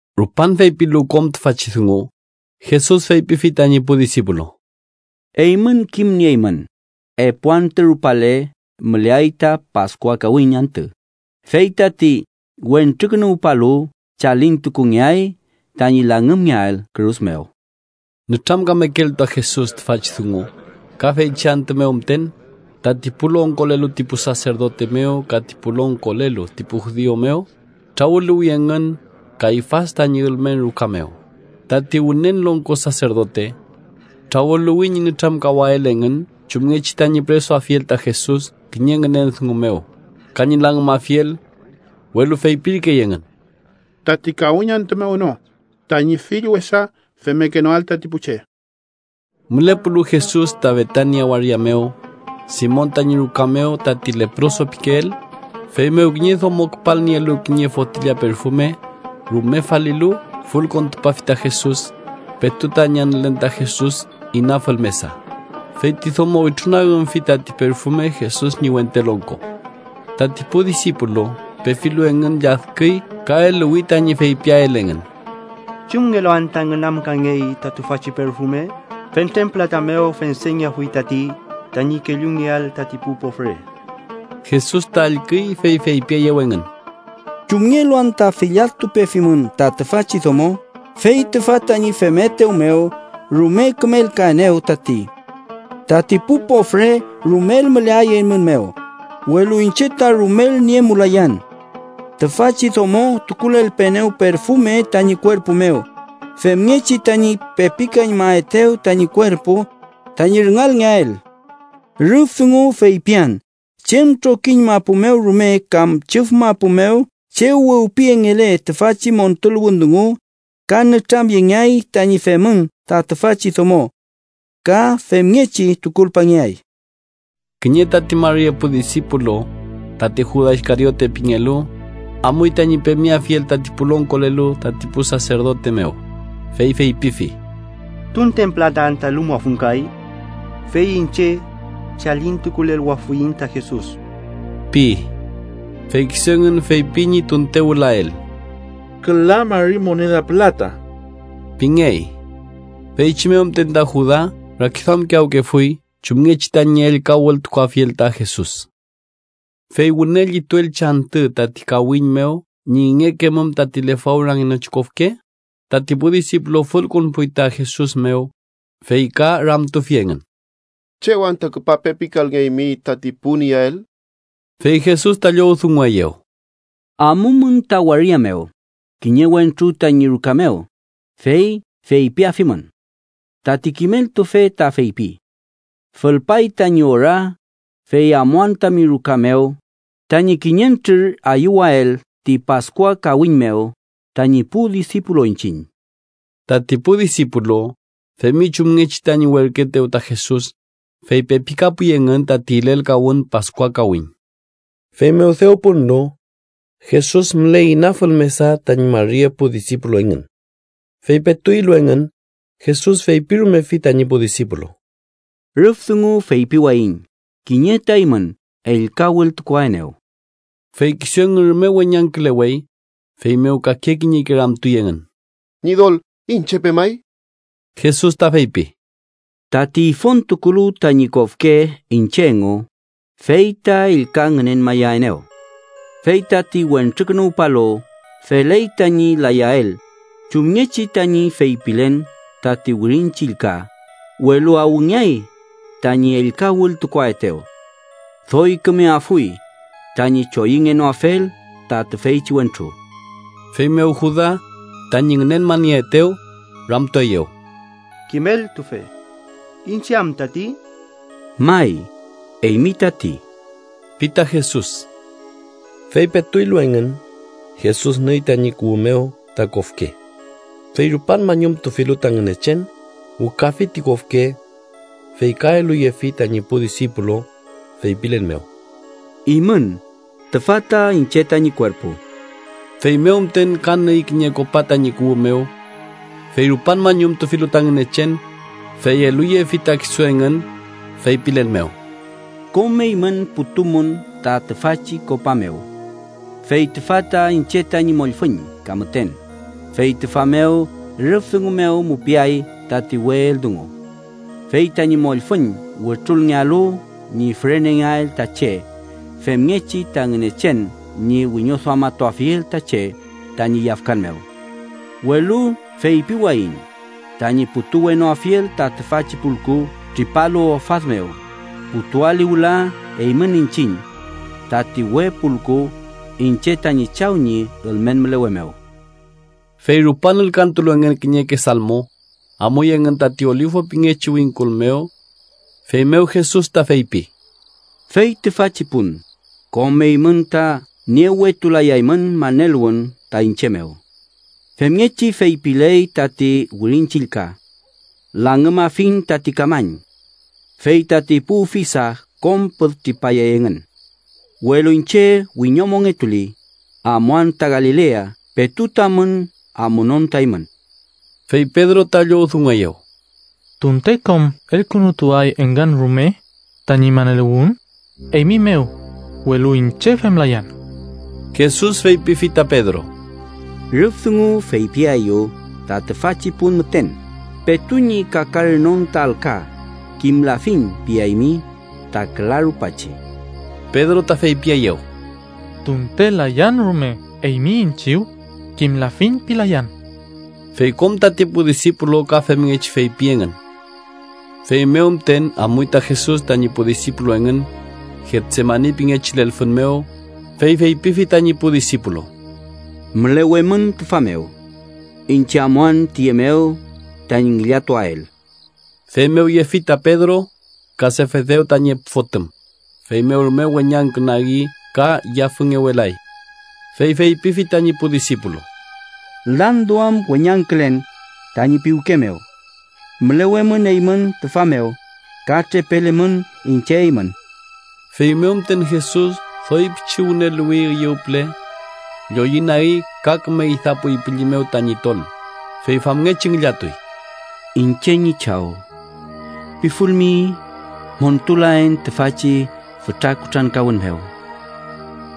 Rupan feypilu kom tüfachi dungu, Jesus feypifi tañi pu disipulu: “Eymün kimnieymün, epu antü rupale müleay tati Paskua kawiñ antü, fey tati Wentrukünuwpalu chalintukungeay tañi langümngeael kürus mew.” Nütramkamekelu ta Jesus tüfachi dungu, ka feychi antü mew müten, tati pu longkolelu ti pu saserdote mew ka ti pu longkolelu ti pu judiu mew trawüluwi engün Kayfas tañi ülmen ruka mew, tati Wünen Longko Saserdote. Trawüluwi ñi nütramkawael engün chumngechi tañi püresuafiel ta Jesus kiñe ngünen dungu mew, ka ñi langümafiel. Welu feypirkey engün: “Tati kawiñ antü mew no, tañi fill wesa femmekenoael tati pu che.” Mülepulu Jesus ta Betania waria mew, Simon tañi ruka mew, tati leproso pikeel, feymew kiñe domo küpalnielu kiñe fotilla perfume, rume falilu, fülkontupafi ta Jesus. Petu tañi anülen ta Jesus inafül mesa, fey ti domo wütrunagümfi tati perfume Jesus ñi wente longko. Tati pu disipulu pefilu engün, lladküy ka eluwi tañi feypiael engün: —¿Chumngelu anta ngünamkangey ta tüfachi perfume? Fentren pülata mew fendengeafuy tati, tañi kellungeael tati pu pofre. Jesus ta allküy, fey feypieyew engün: —¿Chumngelu anta filladtupefimün ta tüfachi domo? Fey tüfa tañi femetew mew rume kümelkaenew tati. Tati pu pofre rumel müleay eymün mew, welu iñche ta rumel niemulayan. Tüfachi domo tukulelpeenew perfume tañi kuerpu mew, femngechi tañi pepikañmaetew tañi kuerpu tañi rüngalngeael. Rüf dungu feypian chem trokiñ mapu mew rume kam chüf mapu mew chew wewpiyengele tüfachi montuluwün dungu, ka nütramyengeay tañi femün ta tüfachi domo. Ka femngechi tukulpangeay. Kiñe tati mari epu disipulu, tati Juda Iskariote pingelu, amuy tañi pemeafiel tati pu longkolelu tati pu saserdote mew, fey feypifi: —¿Tunten pülata anta elumuafun kay? Fey iñche chalintukuleluwafuiñ ta Jesus ―pi. Fey kisu engün feypi ñi tunte wülael: —Küla mari moneda pülata ―pingey. Feychi mew müten ta Juda rakiduamkiyawkefuy chumngechi tañi ellka wültukuafiel ta Jesus. Fey wüne llituelchi antü tati kawiñ mew ñi ingekemum tati lefawrangenochi kofke, tati pu disipulu fülkonpuy ta Jesus mew, fey ka ramtufi engün: —¿Chew anta küpa pepikalngeymi tati pun iyael? Fey Jesus ta llowdungueyew: —Amumün ta waria mew, kiñe wentru tañi ruka mew, fey feypiafimün: ‘Tati kimeltufe ta feypi: Fülpay tañi ora, fey amuan tami ruka mew tañi kiñentrür ayüwael ti Paskua kawiñ mew tañi pu disipulu iñchiñ.’ Tati pu disipulu femi chumngechi tañi werküetew ta Jesus, fey pepikapuy engün tati ilelkawün Paskua kawiñ. Feymew dew punlu, Jesus müley inafül mesa tañi mari epu disipulu engün. Fey petu ilu engün, Jesus feypirumefi tañi pu disipulu: —Rüf dungu feypiwayiñ kiñe ta eymün ellka wültukuaenew. Fey kisu engün rume weñangkülewey, feymew kake kiñeke ramtuy engün: —Ñidol, ¿iñche pemay? Jesus ta feypi: —Tati ifontukulu tañi kofke iñche engu, fey ta ellka ngünenmayaenew. Fey tati Wentrukünuwpalu feley tañi layael chumngechi tañi feypilen tati Wirin Chillka, welu ¡awngeay tañi ellka wültukuaetew! Doy kümeafuy tañi choyüngenoafel ta tüyechi wentru. Feymew Juda, tañi ngünenmanieetew, ramtueyew: —Kimeltufe, ¿iñche am tati? —May, eymi tati ―pi ta Jesus. Fey petu ilu engün, Jesus nüy tañi kuwü mew ta kofke. Fey rupan mañumtufilu ta Ngünechen, wükafi ti kofke. Fey ka eluyefi tañi pu disipulu, feypilen mew: —Imün tüfa ta iñche tañi kuerpu. Feymew müten ka nüy kiñe kopa tañi kuwü mew. Fey rupan mañumtufilu ta Ngünechen, fey eluyefi ta kisu engün, feypilen mew: —Kom eymün putumün ta tüfachi kopa mew. Fey tüfa ta iñche tañi mollfüñ ka müten, fey tüfa mew rüf dungu mew mupiay tati we eldungu. Fey tañi mollfüñ wütrulngealu ñi fürenengeael ta che femngechi ta Ngünechen ñi wiñoduamatuafiel ta che tañi yafkan mew. Welu feypiwayiñ tañi putuwenoafiel ta tüfachi pulku tripalu ofad mew, putuali wüla eymün iñchiñ tati we pulku iñche tañi Chaw ñi ülmen mülewe mew. Fey rupan ülkantulu engün kiñeke salmo, amuy engün tati Olifu pingechi wingkul mew. Feymew Jesus ta feypi: —Fey tüfachi pun kom eymün ta niewetulayaymün maneluwün ta iñche mew. Femngechi feypiley tati Wirin Chillka: ‘Langümafiñ tati kamañ. Fey tati pu ufisa kom püd tripayay engün.’ Welu iñche wiñomongetuli, amuan ta Galilea petu tamün amunon ta eymün. Fey Pedro ta llowdungueyew: —Tunte kom elkünutuay engün rume tañi maneluwün eymi mew, welu iñche femlayan. Jesus feypifi ta Pedro: —Rüf dungu feypiaeyu ta tüfachi pun müten, petu ñi kakaranon ta alka ‘kimlafiñ’ piaymi ta küla rupachi. Pedro ta feypieyew: —Tunte layan rume eymi iñchiw, ‘kimlafiñ’ pilayan. Fey kom tati pu disipulu ka femngechi feypi engün. Feymew müten amuy ta Jesus tañi pu disipulu engün Getsemani pingechi lelfün mew, fey feypifi tañi pu disipulu: —Mülewemün tüfa mew. Iñche amuan tiye mew tañi ngillatuael. Feymew yefi ta Pedro ka Sefedew tañi epu fotüm, feymew rume weñangkünagi ka yafüngewelay. Fey feypifi tañi pu disipulu: —Landuam weñangkülen tañi piwke mew. Mülewemün eymün tüfa mew, ka trepelemün iñche eymün. Feymew müten Jesus doy pichi wüneluwi üyew püle. Lloyünagi ka küme idapuy pülli mew tañi tol, fey famngechi ngillatuy: “Iñche ñi Chaw, pifulmi, montulaen tüfachi fütra kutrankawün mew,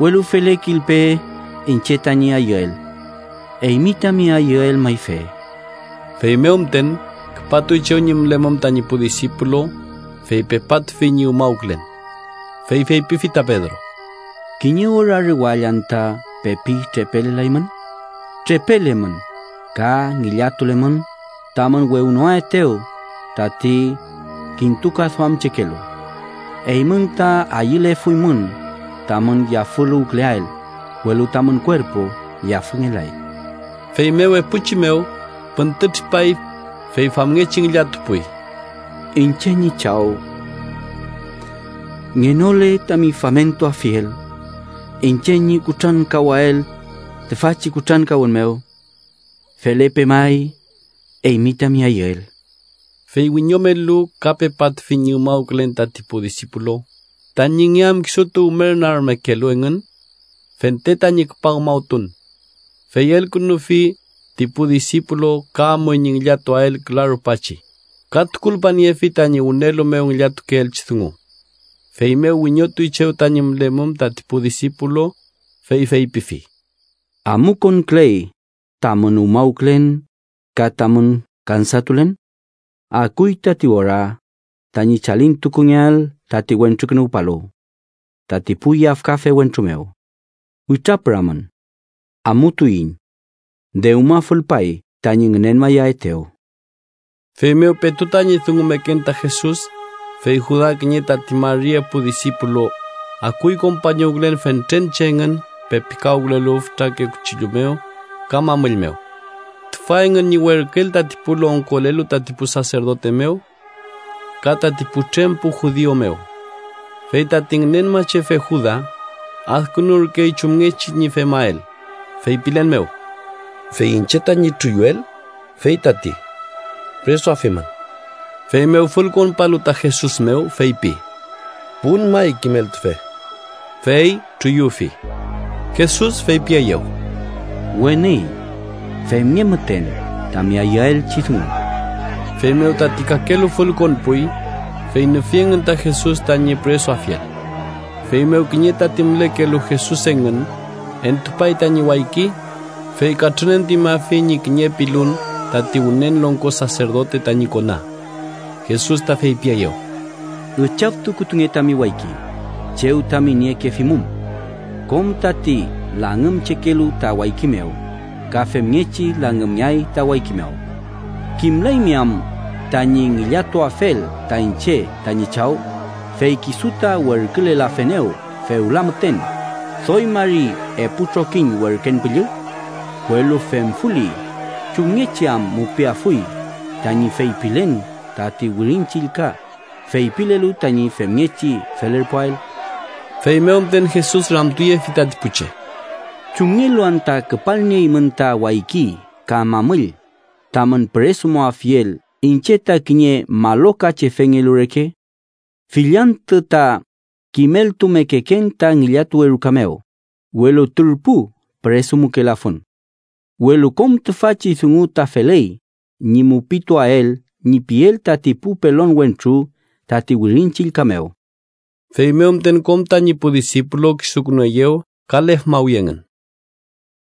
welu felekilpe iñche tañi ayüel, eymi tami ayüel mayfe.” Feymew müten küpatuy chew ñi mülemum tañi pu disipulu, fey pepatufi ñi umawkülen. Fey feypifi ta Pedro: —¿Kiñe ora rewall anta pepi trepelelaymün? Trepelemün, ka ngillatulemün, tamün wewnoaetew tati kintukaduamchekelu. Eymün ta ayülefuymün tamün yafüluwküleael, welu tamün kuerpu yafüngelay. Feymew epuchi mew püntütripay, fey famngechi ngillatupuy: “Iñche ñi Chaw, ngenole tami famentuafiel iñche ñi kutrankawael tüfachi kutrankawün mew, felepe may eymi tami ayüel.” Fey wiñomelu, ka pepatufi ñi umawkülen tati pu disipulu, tañi nge am kisutu umernagmekelu engün fente tañi küpa umawtun. Fey elkünufi ti pu disipulu ka amuy ñi ngillatuael küla rupachi, ka tukulpaniefi tañi wünelu mew ngillatukeelchi dungu. Feymew wiñotuy chew tañi mülemum tati pu disipulu, fey feypifi: —¿Amukonküley tamün umawkülen ka tamün kansatulen? Akuy tati ora tañi chalintukungeael tati Wentrukünuwpalu tati pu yafkafe wentru mew. Witrapüramün. Amutuiñ. Dewma fülpay tañi ngünenmayaetew. Feymew petu tañi dungumeken ta Jesus, fey Juda, kiñe tati mari epu disipulu, akuy kompañuwkülen fentren che engün pepikawkülelu fütrake kuchillu mew ka mamüll mew. Tüfa engün ñi werküel tati pu longkolelu tati pu saserdote mew ka tati putrem pu judiu mew. Fey tati ngünenmachefe Juda, adkünurkey chumngechi ñi femael, feypilen mew: “Fey iñche tañi truyuel, fey tati. Püresuafimün.” Feymew, fülkonpalu ta Jesus mew, feypi: —¡Pun may, kimeltufe! Fey truyufi. Jesus feypieyew: —Weni, femnge müten tami ayüelchi dungu. Feymew tati kakelu fülkonpuy, fey nüfi engün ta Jesus tañi püresuafiel. Feymew, kiñe tati mülekelu Jesus engün entupay tañi wayki, fey katrünentuñmafi ñi kiñe pilun tati Wünen Longko Saserdote tañi kona. Jesus ta feypieyew: —Üchaftukutunge tami wayki chew tami niekefimum. Kom tati langümchekelu ta wayki mew, ka femngechi langümngeay ta wayki mew. ¿Kimlaymi am tañi ngillatuafel ta iñche tañi Chaw, fey kisu ta werkülelafenew fewla müten doy mari epu trokiñ werken püllü? Welu femfuli, ¿chumngechi am mupiafuy tañi feypilen tati Wirin Chillka, feypilelu tañi femngechi felerpuael? Feymew müten Jesus ramtuyefi tati pu che: —¿Chumngelu anta küpalnieymün ta wayki ka mamüll tamün püresumuafiel iñche ta kiñe malochefengelu reke? Fill antü ta kimeltumekeken ta ngillatuwe ruka mew, welu turpu püresumukelafun. Welu kom tüfachi dungu ta feley ñi mupituael ñi piel tati pu pelon wentru tati Wirin Chillka mew. Feymew müten, kom tañi pu disipulu kisukünueyew ka lefmawi engün.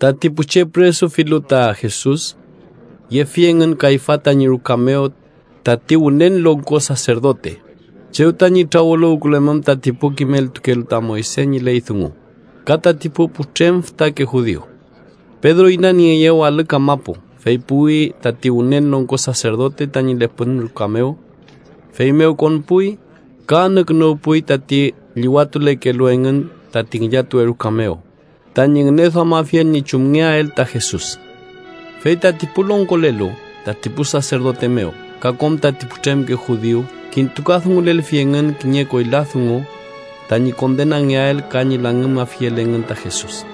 Tati pu che püresufilu ta Jesus, yefi engün Kayfas tañi ruka mew, tati Wünen Longko Saserdote, chew tañi trawüluwkülemum tati pu kimeltukelu ta Moyse ñi ley dungu ka tati pu putrem fütake judiu. Pedro inanieeyew alü kamapu, fey puwi tati Wünen Longko Saserdote tañi lepün ruka mew. Feymew konpuy, ka anükünuwpuy tati llüwatulekelu engün tati ngillatuwe ruka mew tañi ngüneduamafiel ñi chumngeael ta Jesus. Fey tati pu longkolelu tati pu saserdote mew ka kom tati putremke judiu kintukadungulelfi engün kiñe koyla dungu tañi kondenangeael ka ñi langümafiel engün ta Jesus,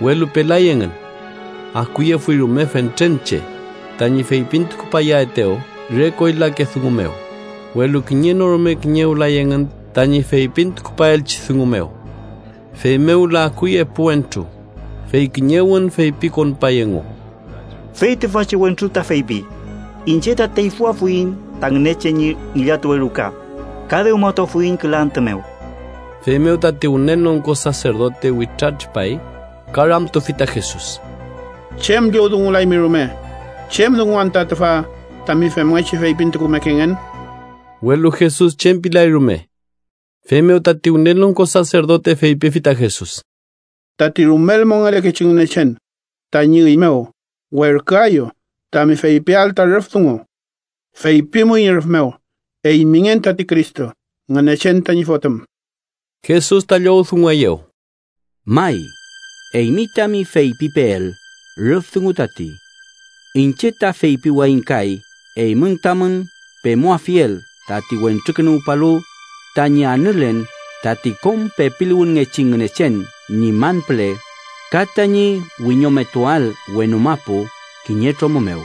welu pelay engün. Akuyefuy rume fentren che tañi feypintukupayaetew re koylake dungu mew, welu kiñe no rume kiñewlay engün tañi feypintukupaelchi dungu mew. Feymew wüla akuy epu wentru, fey kiñewün feypikonpay engu: —Fey tüfachi wentru ta feypi: ‘Iñche ta teyfüafuiñ ta Ngünechen ñi ngillatuwe ruka ka dewmatuafuiñ küla antü mew.’ Feymew tati Wünen Longko Saserdote witratripay, ka ramtufi ta Jesus: —¿Chem llowdungulaymi rume? ¿Chem dungu anta tüfa tami femngechi feypintukumekengen? Welu Jesus chem pilay rume. Feymew tati Wünen Longko Saserdote feypifi ta Jesus: —Tati rumel mongelekechi Ngünechen tañi üy mew werküaeyu tami feypiael ta rüf dungu. Feypimuiñ rüf mew eymingen tati Cristo, Ngünechen tañi Fotüm. Jesus ta llowdungueyew: —May, eymi tami feypipeel rüf dungu tati. Iñche ta feypiwayiñ kay eymün tamün pemuafiel tati Wentrukünuwpalu tañi anülen tati kom pepiluwünngechi Ngünechen ñi man püle, ka tañi wiñometuael wenu mapu kiñe tromü mew.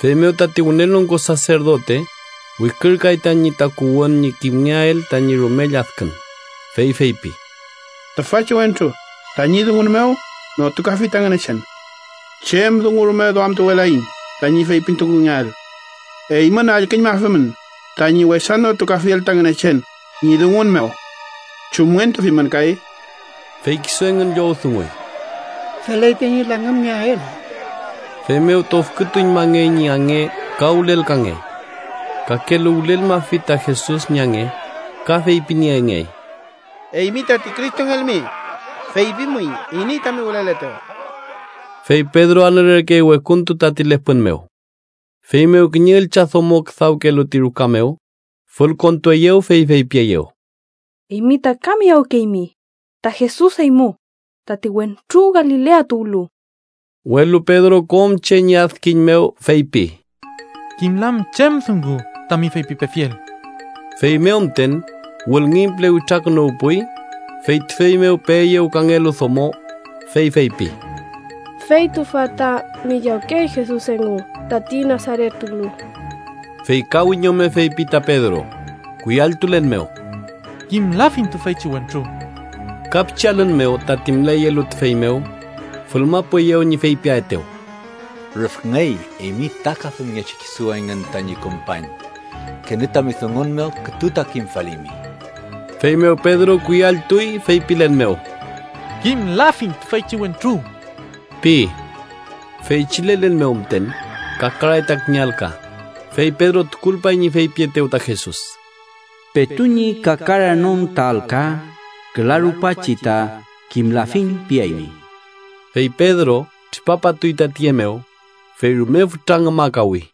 Feymew tati Wünen Longko Saserdote wikürkay tañi takuwün ñi kimngeael tañi rume lladkün, fey feypi: —¡Tüfachi wentru tañi dungun mew notukafi ta Ngünechen! Chem dungu rume duamtuwelaiñ tañi feypintukungeael. ¡Eymün allküñmafimün tañi wesa notukafiel ta Ngünechen ñi dungun mew! ¿Chumngentufimün kay? Fey kisu engün llowdunguy: —Feley tañi langümngeael. Feymew tofkütuñmangey ñi ange ka wülelkangey. Kakelu wülelmafi ta Jesus ñi ange, ka feypiniengey: —Eymi tati Cristongelmi, ¡feypimuiñ iney tami wüleletew! Fey Pedro anülerkey wekuntu, tati lepün mew. Feymew, kiñe üllchadomo küdawkelu ti ruka mew, fülkontueyew, fey feypieyew: —Eymi ta ka miyawkeymi ta Jesus eymu, tati wentru Galilea tuwlu. Welu Pedro kom che ñi adkiñ mew, feypi: —Kimlan chem dungu tami feypipefiel. Feymew müten wülngiñ püle witrakünuwpuy, fey tüfey mew peeyew kangelu domo, fey feypi: —Fey tüfa ta miyawkey Jesus engu, tati Nasaret tuwlu. Fey ka wiñome feypi ta Pedro, kuyalltulen mew: —¡Kimlafin tüfeychi wentru! Ka pichi alün mew, tati müleyelu tüfey mew fülmapueyew ñi feypiaetew: —Rüfngey eymi ta ka femngechi kisu engün tañi kompañ. Kenü tami dungun mew kütu ta kimfalimi. Feymew Pedro kuyalltuy, feypilen mew: —¡Kimlafiñ tüfeychi wentru! ―pi. Feychi lelen mew müten kakaray ta kiñe alka, fey Pedro tukulpay ñi feypietew ta Jesus: “Petu ñi kakaranon ta alka, küla rupachi ta ‘kimlafiñ’ piaymi.” Fey Pedro tripapatuy ta tiye mew, fey rume fütra ngümakawi.